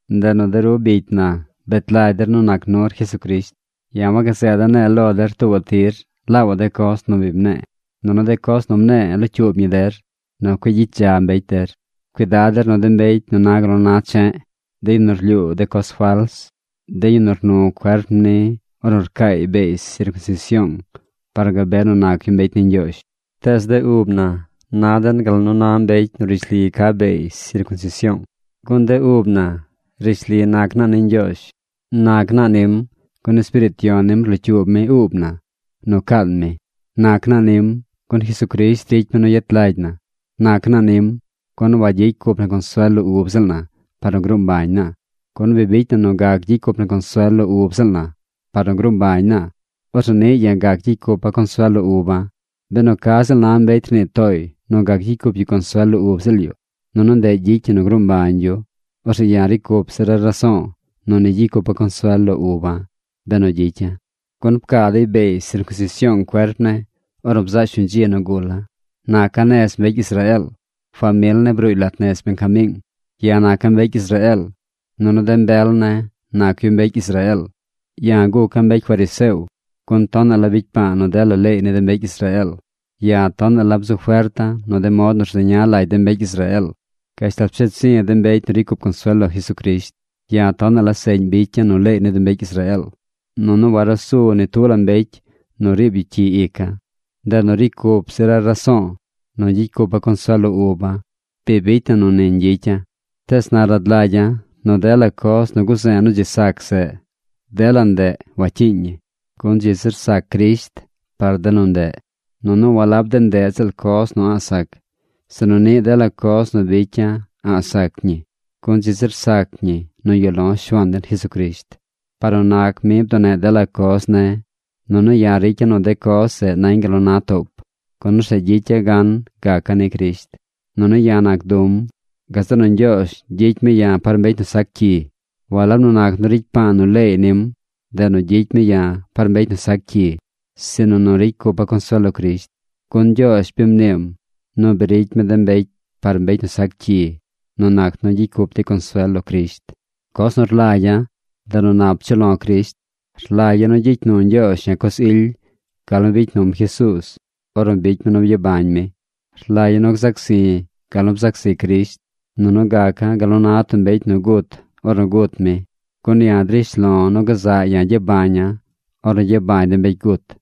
Ndeꞌ nu de ru bicy na, bet lagy der nu nac nur Jesucrisht. Ya̱ wagazeeda̱ ne̱e̱ lo der tuubaꞌ tir laabaꞌ de coz nu bi mne̱e̱, nunu de coz nu mne̱e̱ locyuub ñi der nu cueꞌ gyicy dza mbecy der. Cuidad der nu de mbecy nu na gal nu na che̱ꞌ, de yu nu rlyuu de coz fals, de yu nu rnu cuerp ni ornu rcaay beey sircunsision par nu gabe nu nac yu mbecy ni Ñgyoozh. Tees de ub na na den gal nu na mbecy nu rishli ca beey sircunsision, gun de ub na rishli nac naa ni Ñgyoozh. Nac naa nim, gun Espiriit Yon nim rlocyuub mi uub na nu caan mi. Nac naa nim, gun Jesucrisht ricy mi nu yet lagy na. Nac naa nim, gun wagyicy cup na consuel lo ub ziꞌl na par nu gruu mbañ naa. Gun bi bicy na nu gac gyicy cup na consuel lo ub ziꞌl na par nu gruu mbañ na, orzeꞌ niꞌ ya̱ gac gyicy cupa̱ consuel lo uba̱. Benu ca ziꞌl na mbecy rnii tooy nu gac gyicy cup yu consuel lo ub ziꞌl yu, nunu ndeꞌ gyicy ñi nu gruu mbañ yu, orzeꞌ ya̱ ricy cup zira̱ raso̱o̱ nu ni gyicy cupa̱ consuel lo uba̱, benu gyicya̱. Gun pcaa dey beey sircunsision cuerp ne̱ ornu bzaꞌ shuñ dzi nu gula̱. Naca̱ nez mbecy Israeel. Famil ne̱ bruuy lat nez Benjamiing. Ya̱ naca̱ mbecy Israeel, nunu de mbel ne̱ nac yu mbecy Israeel. Ya̱ guca̱ mbecy fariseo, gun tonaꞌ la bicy pa̱a̱ nu dela leey ni de mbecy Israeel. Ya̱ tonaꞌ la bzu ferta̱ nu de mod nu rzeña lagy de mbecy Israeel, gashtal psheed zi̱ de mbecy nu ricy cup consuel lo Jesucrisht. Ya̱ tonaꞌ la seꞌñ bicya̱ nu leey ni de mbecy Israeel, nunu warusu ni tub la mbecy nu riib yu cyi ica̱. Ndeꞌ nu ricy cup zira̱ raso̱o̱ nu gyicy cupa̱ consuel lo uba̱, bi bicy na nu ni ñgyicya̱. Tees na rad lagya̱ nu dela coz nu guze̱e̱ nu dzi sac zeꞌ, dela ndeꞌ wacyiiñ ñi, gun dzi zir sac Crisht par de nu ndeꞌ. Nunu walab de ndeꞌ ziꞌl coz nu a̱ꞌ sac, sinu niꞌ dela coz nu bicya̱ a̱ꞌ sac ñi, gun dzi zir sac ñi nu yuꞌ lo̱ Shuaan den Jesucrisht. Par nu nac mi bduneꞌ dela coz ne̱. Nunu ya̱ ricya̱ nu de coz zeꞌ nañ gal nu na toop, gun orzeꞌ gyicya̱ gan gaca̱ ni Crisht. Nunu ya̱ nac du̱m. Gazeꞌ nu Ñgyoozh gyicy mi ya̱ par mbecy nu sac cyi. Walab nu nac nu ricy pa̱a̱ nu leey nim, ndeꞌ nu gyicy mi ya par mbecy nu sac cyi, sinu nu ricy cupa̱ consuel lo Crisht. Gun Ñgyoozh bi mniim nu bi ricy mi de mbecy par mbecy nu sac cyi nu nac nu gyicy cup dey consuel lo Crisht. Coz nu rlagya̱, ndeꞌ nu nap chuꞌ lo̱ Crisht. Rlagya̱ nu gyicy nu Ñgyoozh ya̱ coz ily gal nu bicy num Jesuuz ornu bicy mi nu byabañ mi. Rlagya̱ nu gzac zi̱ gal nu bzac zi Crisht, nunu gaca̱ gal nu na tub mbecy nu gut ornu gut mi. Gun ya̱ drish lo̱ nu gazaꞌ ya̱ gyabaña̱ ornu gyabañ de mbecy gut.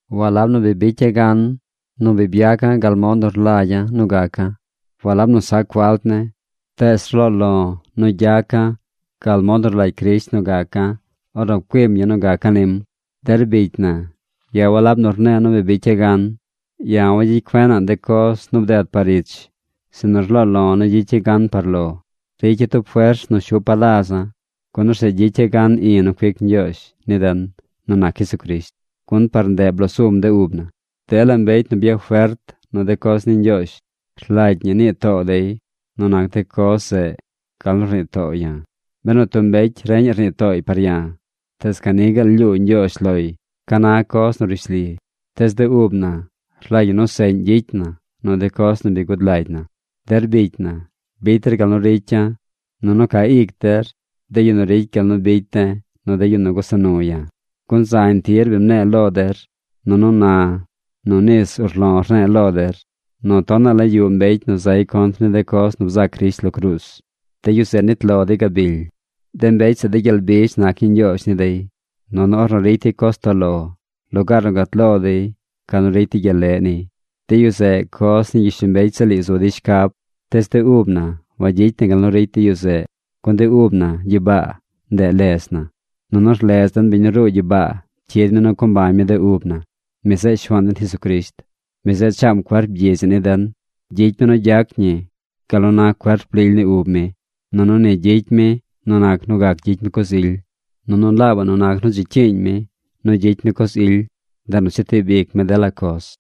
Walab nu bi bicya̱ gan nu bi byaca̱ gal mod nu rlagya̱ nu gaca̱. Walab nu sac falt ne̱. Tees rloo lo̱ nu gyaca̱ gal mod nu rlagy Crisht nu gaca̱ ornu pcuim ya̱ nu gaca̱ nim. Der bicy na, ya̱ walab nu rne̱e̱ nu bi bicya̱ gan. Ya̱ wagyicy cuena̱ꞌ de coz nu bded par ich, sinu rloo lo̱ nu gyicya̱ gan par lo. Ricya̱ tub fers nu shupa̱ laza̱, gun orzeꞌ gyicya̱ gan i̱ nu cuic Ñgyoozh ni den nu nac Jesucrisht. Gun par ndeꞌ blosum de ub na. Dela mbecy nu byafert nu de coz ni Ñgyoozh rlagy ñi nii too dey nu nac de coz zeꞌ gal nu rnii to̱o̱ ya̱. Benu tub mbecy reñaꞌ rnii tooy par ya̱, tees ca ni gaal lyuu Ñgyoozh loy ca na coz nu rishli. Tees de ub na rlagy ñi nu seꞌñ gyicy na nu de coz nu bi gud lagy na. Der bicy na, bicy der gal nu ricy ya̱, nunu ca ic der de yu nu ricy gal nu bicy de̱ nu de yu nu gusa nu ya̱. Gun zañ tir bi mne̱e̱ lo der, nunu na nu nis urlo̱ rne̱e̱ lo der, nu tonaꞌ la yuꞌ mbecy nu zay contr ni de coz nu bzac Crisht lo cruuz. De yu zeꞌ nit lo dey gabily. De mbecy zeꞌ de gyel bizh nac ñii ñgyoozh ni dey, nunu ornu ricy dey coz toꞌ lo, lugaar nu gat lo dey ca nu ricy dey gyel leꞌ niy. De yu zeꞌ coz ni gyishlombecy ziꞌl ii zu dey shcab. Tees de ub na wagyicy na gal nu ricy de yu zeꞌ, gun de ub na gyibaa, ndeꞌ ledz na. Nunu rlez den biñ nu ruu gyibaa cyid mi nu co mbañ mi de ub na. Mi zeꞌ Shuaan den Jesucrisht. Mi zeꞌ chaam cuerp gyidz ii ni den. Gyicy mi nu gyac ñi gal nu na cuerp lily ni ub mi. Nunu ni gyicy mi nu nac nu gac gyicy mi coz ily, nunu laabaꞌ nu nac nu dzi cyiiñ mi nu gyicy mi coz ily, ndeꞌ nu chetib ic mi dela coz.